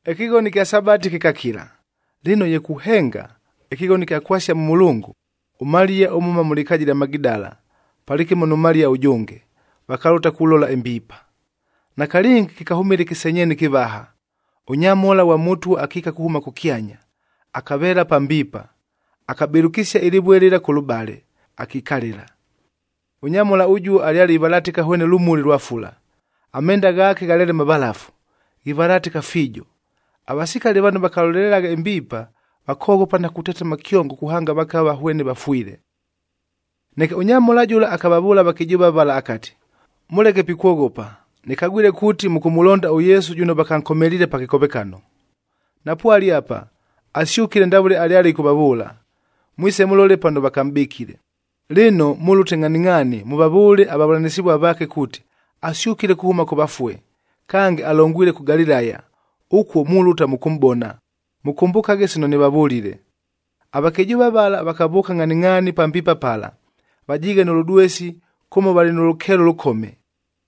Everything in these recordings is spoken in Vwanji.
Ɨkɨghono ɨkya Sabati kɨkakila. Lɨno ye kuhenga, ɨkɨghono ɨkya kwasia mʉ mʉlʉngʉ, ʉMaliya ʉmhʉma mʉ lɨkaaja ɨlya Magidala palɨkɨmo nʉ Maliya ʉjʉnge, vakalʉta kulola ɨmbiipa. Nakalɨngi, kɨkahʉmɨla ɨkɨsenyeena ɨkɨvaha. Ʉnyamhola ghwa Mʉtwa akiika kuhʉma kʉkyanya, akaveela pa mbiipa, akabɨlʉkɨsia ɨlɨvue lɨla kʉlʉbale, akikalɨla. Ʉnyamhola ʉjuo alyale ivalatɨka hwene lʉmuli lwa fula, amenda ghaake ghalyale mavalafu, ghivalatɨka fiijo. Avasikali vano vakalolelelagha ɨmbiipa, vakoghopa na kutetema kyongo kuhanga vakava hwene vafwile. Neke ʉnyamhola jʉla akavavʉʉla avakɨjʉʉva vala akati, “Mʉleke pikwoghopa! Nɨkagwile kuuti, mʉkʉmʉlonda ʉYesu jʉno vakankomeliile pa kɨkovekano. Napwale apa, asyʉkile ndavʉle alyale ɨkʉvavʉʉla. Mwise mʉlole pano vakamʼbɨkile. Lɨno, mʉlʉte ngʼhaningʼhaani mʉvavʉʉle avavʉlanɨsɨvua vaake kuuti, ‘Asyʉkile kuhʉma kʉ vafue. Kange, alongwile kʉ Galilaya, ʉkuo mulʉta mʉkʉmʼbona.’ Mʉkʉmbʉkaghe sino nɨvavʉlile!” Avakɨjʉʉva vala vakavʉʉka ngʼhaningʼhaani pa mbiipa pala, vajiighe nʉ lʉdwesi kʉmo valɨ nʉ lʉkeelo ʉlʉkome.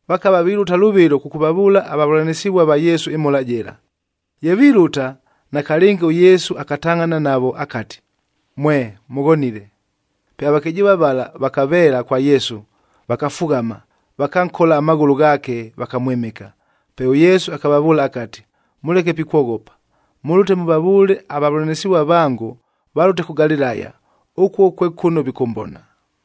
Vakava vilʉta lʉvɨlo kʉkʉvavʉʉla avavʉlanɨsɨvua va Yesu ɨmhola jɨla. Ye vilʉta, nakalɨngi ʉYesu akatangʼhana navo akati, “Mwe! Mʉghonile!” Pe avakɨjʉʉva vala vakaveela kwa Yesu, vakafughama, vakankola amaghʉlʉ ghaake vakamwɨmɨka. Pe ʉYesu akavavʉʉla akati, “Mʉleke pikwoghopa. Mʉlʉte mʉvavʉʉle avavʉlanɨsɨvua vangoa valʉte kʉ Galilaya, ʉkuo kwe kʉno vikʉmbona.”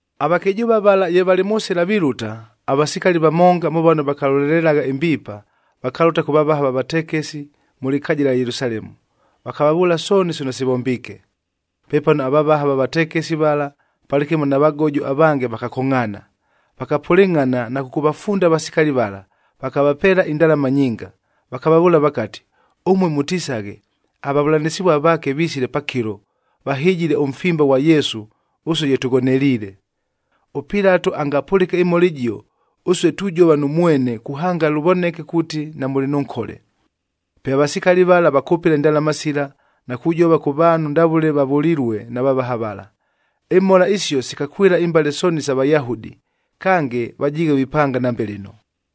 Avakɨjʉʉva vala ye valɨ mʉ sɨla vilʉta, avasikali vamonga mʉ vano vakalolelelagha ɨmbiipa, vakalʉta kʉ vavaha va vatekesi mʉ lɨkaaja ɨlya Yelusalemu, vakavavʉʉla sooni sino sivombiike. Pepano avavaha va vatekesi vala palɨkɨmo na vagojo avange vakakongʼhaana. Vakapʉlɨngʼhana na kʉkʉvafunda avasikali vala, vakavapeela indalama nyinga, vakavavʉʉla vakati, “Ʉmue mʉtisaghe, ‘Avavʉlanɨsɨvua vaake visile pakɨlo, vahɨjile ʉmfimba ghwa Yesu ʉsue ye tʉghoneliile.’ ɄPilato angapʉlɨke ɨmhola ɨjio, ʉsue tujova nʉ mwene kuhanga lʉvoneke kuuti namʉlɨ nʉ nkole.” Pe avasikali vala vakʉpɨla indalama sila na kujova kʉ vaanhu ndavʉle vavʉlilue na vavaha vala. Imhola isio sikakwɨla imbale sooni isa Vayahudi, kange vajiighe vipanga nambe lɨno.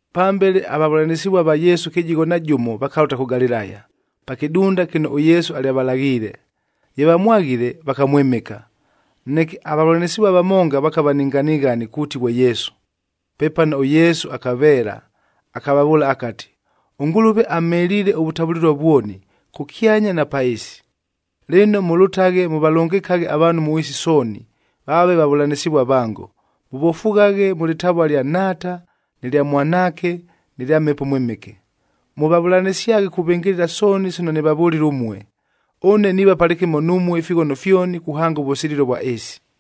Pambele avavʉlanɨsɨvua va Yesu kɨjigho na jʉmo vakalʉta kʉ Galilaya, pa kɨdunda kɨno ʉYesu alyavalaghiile. Ye vamwaghile, vakamwɨmɨka, neke avavʉlanɨsɨvua vamonga vakava ni nganighani kuuti ghwe Yesu. Pepano ʉYesu akaveela, akavavʉʉla akati, “ɄNgʉlʉve amheliile ʉvʉtavʉlɨlua vwoni, kʉkyanya na pa ɨɨsi. Lɨno, mʉlʉtaghe mʉvalʉngɨkaghe avaanhu mʉ ɨɨsi sooni, vaave vavʉlanɨsɨvua vango, mʉvofughaghe mʉ lɨtavua ɨlya Nhaata, nɨ lya Mwanaake nɨ lya Mhepo ʉMwɨmɨke. Mʉvavʉlanɨsyaghe kuvɨngɨlɨla sooni sino nɨvavʉlile ʉmue. Ʉne niiva palɨkɨmo numue ifighono fyoni, kuhanga ʉvʉsililo vwa ɨɨsi.”